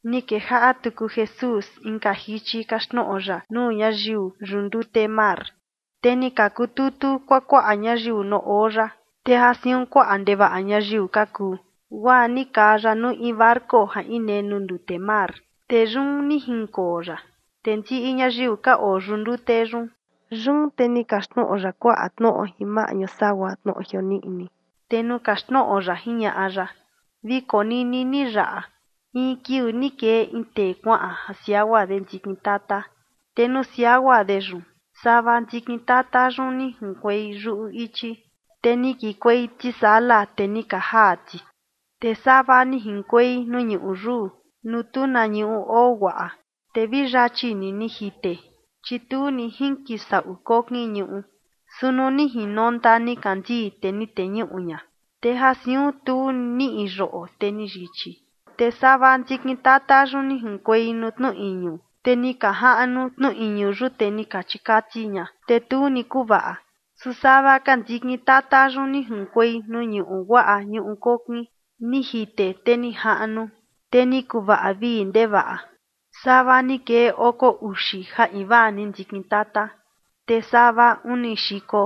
Ni kejaꞌa tuku Jesús inka jichi kaxtnoꞌo ya nuu ñayiu yuꞌu ndute mar. Te ni ka kututu kuakuaꞌa ñayiu nuu oo ya, te ja siun kuaꞌa ndevaꞌa ñayiu ka kuu, guaa ni kaa ya nuu in barco ja inee nuu ndute mar, te yun ni jinkoo ya, te ndiꞌi ñayiu ka oo yuꞌu ndute yun. Yun te ni kaxtnoꞌo ya kuaꞌa tnoꞌo jin maꞌñu sagua tnoꞌo jioniꞌni, te nuu kaxtnoꞌo ya jiñaꞌa ya: ―Vi konini ni yaꞌa: In kiuu ni kee in tee kuaꞌan ja siagua de ndikin tata. Te nuu siagua de yun, sava ndikin tata yun ni junkuei yuꞌu ichi, te ni kikuei tisala, te ni ka jaa ti. Te sava ni jinkuei nuu ñuꞌu yuu, nuu tu na ñuꞌu oo guaꞌa, te vi yachi ni ni jite, chi tu ni jinkisaꞌu kokin ñuꞌu. Su nuu ni jinonta nikandii, te ni teñuꞌu ña, te ja siun tu niꞌi yoꞌo, te ni yichi. Te sava ndikin tata yun ni junkuei nuu tnu iñu, te ni ka jaꞌnu tnu iñu yun, te ni ka chikati ña, te tu ni kuvaꞌa. Su sava ka ndikin tata yun, ni junkuei nuu ñuꞌu guaꞌa, ñuꞌu kokin. Ni jite te ni jaꞌnu, te ni kuvaꞌa vii ndevaꞌa. Sava ni kee oko uxi ja invaa ndikin tata, te sava uni xiko,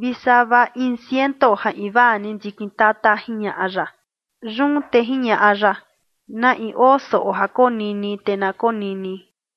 vi sava in ciento ja invaa ni ndikin tata ―jiñaꞌa ya. Yun te jiñaꞌa ya: ―Na in oo soꞌo ja konini, te na konini.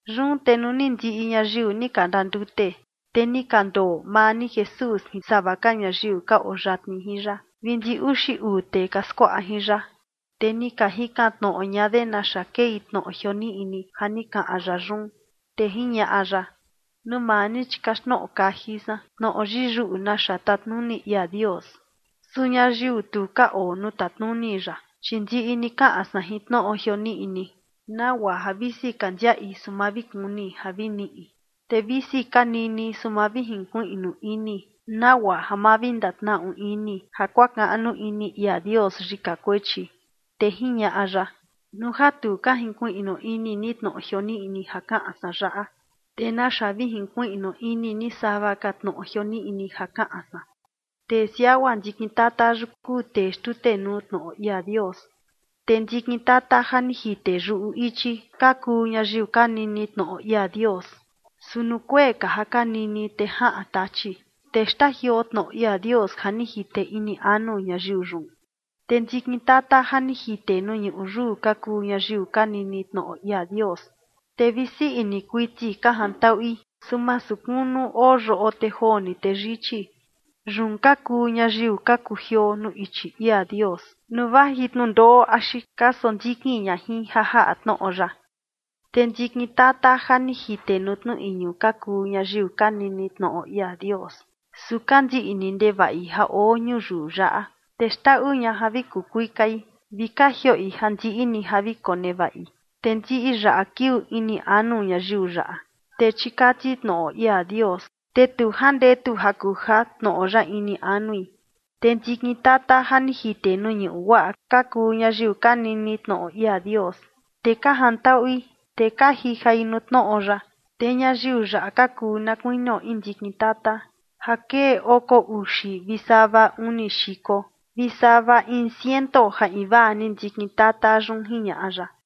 Yun te nuu ni ndiꞌi ñayiu ni ka ndandute, te ni ka ndoo maa ni Jesús jin sava ka ñayiu ka oo yatni jin ya vi ndi uxi uu tee ka skuaꞌa jin ya, te ni ka jikan tnoꞌo ña de naxa kei tnoꞌo jioniꞌni ja ni kaꞌan ya yun. Te jiñaꞌa ya: ―Nuu maa ni, chi kaxtnoꞌo kaji san tnoꞌo yiyuꞌu naxa tatnuni ia Dios. Su ñayiu tu ka oo nuu tatnuni ya, chi ndiꞌi ni kaꞌan san jin tnoꞌo jioniꞌni, nagua ja visi ka ndiaꞌi, su ma vi kuni ja vi niꞌi. Te visi ka nini, su ma vi jinkuiꞌnu ini, nagua ja ma vi ndatnaꞌu ini ja kuakaꞌnu ini ia Dios yika kuechi. Te jiñaꞌa ya: ―Nuu ja tu ka jinkuiꞌnu ini ni tnoꞌo jioniꞌni ja kaꞌan san yaꞌa, ¿te naxa vi jinkuiꞌnu ini ni sava ka tnoꞌo jioniꞌni ja kaꞌan san? Tee siagua ndikin tata yun kuu tee xtutenuu tnoꞌo ia Dios. Te ndikin tata ja ni jite yuꞌu ichi, ka kuu ñayiu ka nini tnoꞌo ia Dios, su nuu kuee ka ja ka nini, te jaꞌan Tachi, te xtajioo tnoꞌo ia Dios ja ni jite ini anu ñayiu yun. Te ndikin tata ja ni jite nuu ñuꞌu yuu ka kuu ñayiu ka nini tnoꞌo ia Dios, te vi sii ini kuiti ka jantaꞌui. Su masu kunu oo yoꞌo, te joo ni, te yichi. Yun ka kuu ñayiu ka kujioo nuu ichi ia Dios, nuu vaji tnundoꞌo axi ka sondikin ña jin ja jaꞌa tnoꞌo ya. Te ndikin tata ja ni jite nuu tnu iñu ka kuu ñayiu ka nini tnoꞌo ia Dios, su ka ndiꞌni ndevaꞌi ja oo ñuyiu yaꞌa, te xndaꞌu ña ja vi kuu kuikai, vi ka jioꞌi ja ndiꞌi ni ja vi konevaꞌi. Te ndiꞌi yaꞌa kiuu ini anu ñayiu yaꞌa, te chikati tnoꞌo ia Dios, te tu jandetu ja kuja tnoꞌo ya ini anui. Te ndikin tata ja ni jite nuu ñuꞌu guaꞌa, ka kuu ñayiu ka nini tnoꞌo ia Dios, te ka jantaꞌui, te ka jijai nuu tnoꞌo ya. Te ñayiu yaꞌa ka kuu na kuinio in ndikin tata ja kee oko uxi vi sava uni xiko vi sava in ciento ja invaa ni ndikin tata yun ―jiñaꞌa ya.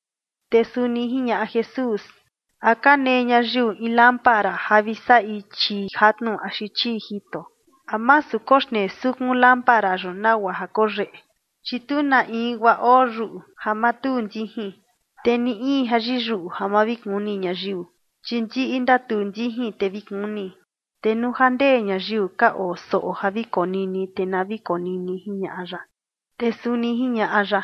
Te suni jiñaꞌa Jesús: ―¿A ka nee ñayiu in lámpara ja vi saꞌi chii jatnu axi chii jito? ¿A masu koxnee sukun lámpara yun nagua ja koyeꞌe? Chi tu na in guaa oo yuꞌu ja ma tuu ndijin, te ni in ja yiyuꞌu ja ma vi kuni ñayiu, chi ndiꞌi ndatuu ndijin, te vi kuni. Te nuu ja ndee ñayiu ka oo soꞌo ja vi konini, te na vi konini ―jiñaꞌa ya. Te suni jiñaꞌa ya: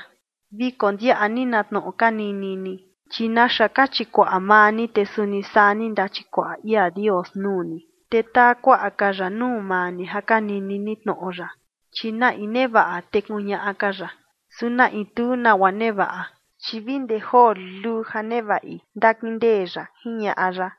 ―Vi kondiaꞌa ni na tnoꞌo ka nini ni, chi naxa ka chikuaꞌa maa ni, te suni saa ni ndachikuaꞌa ia Dios nuu ni, te taa kuaꞌa ka ya nuu maa ni ja ka nini ni tnoꞌo ya. Chi na in nevaꞌa, te kuñaꞌa ka ya, su na in tu nagua nevaꞌa, chi vi ndee joo luluu ja nevaꞌi, ndakindee ya ―jiñaꞌa ya.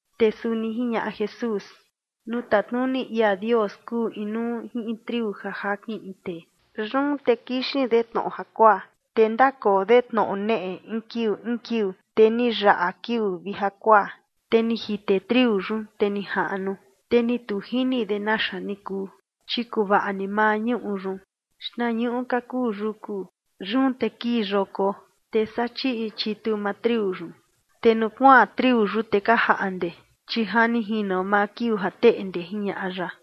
Te suni jiñaꞌa Jesús: ―Nuu tatnuni ia Dios kuu inuu jin in triu ja jakin in tee. Yun te kixin de tnoꞌo jakuaa, te ndakoo de tnoꞌo neꞌe in kiuu in kiuu, te ni yaꞌa kiuu vi jakuaa, te ni jite triu yun, te ni jaꞌnu, te ni tu jini de naxa ni kuu. Chi kuvaꞌa ni maa ñuꞌu yun, xtnañuꞌu ka kuu yuku, yun te kii yoko, te saa chiꞌi chitu maa triu yun. Te nuu kuaan triu yun, te ka jaꞌnde, chi ja ni jino maa kiuu ja teꞌnde ―jiñaꞌa ya.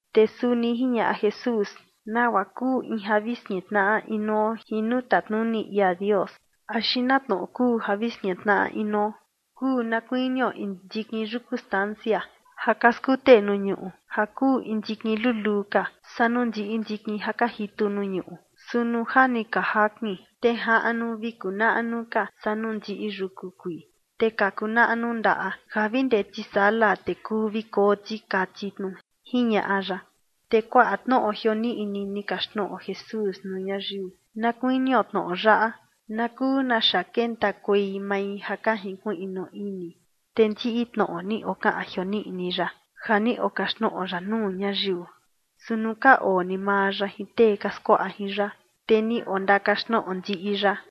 Te suni jiñaꞌa Jesús: ―¿Nagua kuu in ja vi skintnaꞌa inuo jin nuu tatnuni ia Dios, axi na tnoꞌo kuu ja vi skintnaꞌa inuo? Kuu na kuinio in ndikin yuku stancia ja ka skute nuu ñuꞌu ja kuu in ndikin luluu ka saa nuu ndiꞌi ndikin ja ka jitu nuu ñuꞌu. Su nuu ja ni ka jakin, te jaꞌnu vi kuu naꞌnu ka saa nuu ndiꞌi yuku kuii, te ka kuu naꞌnu ndaꞌa ja vi ndee tisala te kuu vi koo ti kati tnu ―jiñaꞌa ya. Te kuaꞌa tnoꞌo jioniꞌni ni kaxtnoꞌo Jesús nuu ñayiu, na kuinio tnoꞌo yaꞌa na kuu naxa kentakuei mai ja ka jinkuiꞌnu ini. Te ndiꞌi tnoꞌo ni okaꞌan jioniꞌni ya ja ni okaxtnoꞌo ya nuu ñayiu. Su nuu ka oo ni maa ya jin tee ka skuaꞌa jin ya, te ni ondakaxtnoꞌo ndiꞌi ya.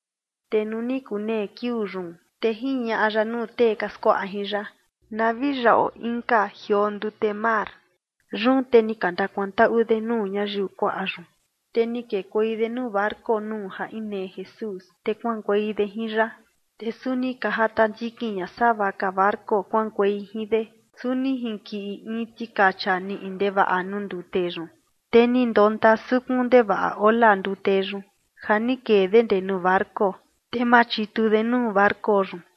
Te nuu ni kunee kiuu yun, te jiñaꞌa ya nuu tee ka skuaꞌa jin ya: ―Na vi yaꞌo inka jioo ndute mar. Yun te ni ka ndakuantaꞌu de nuu ñayiu kuaꞌa yun, te ni kekuei de nuu barco nuu ja inee Jesús, te kuaꞌankuei de jin ya, te suni ka jata ndikin ña sava ka barco kuaꞌankuei jin de. Su ni jinkiꞌi in tikacha niꞌi ndevaꞌa nuu ndute yun, te ni ndonta sukun ndevaꞌa ola ndute yun ja ni kee de ndee nuu barco, te machitu de nuu barco yun.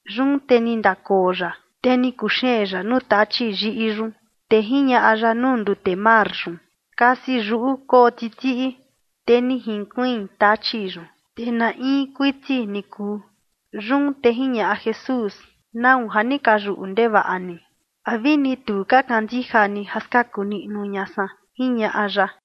Yun te ni ndakoo ya, te ni kuxeen ya nuu tachi yiꞌi yun, te jiñaꞌa ya nuu ndute mar yun: ―Kasi yuꞌu, koo titiꞌi. Te ni jinkuiin tachi yun, te na in kuiti ni kuu. Yun te jiñaꞌa Jesús: ―¿Nau ja ni ka yuꞌu ndevaꞌa ni? ¿A vini tu ka kandija ni ja skaku niꞌnu ña san? ―jiñaꞌa ya.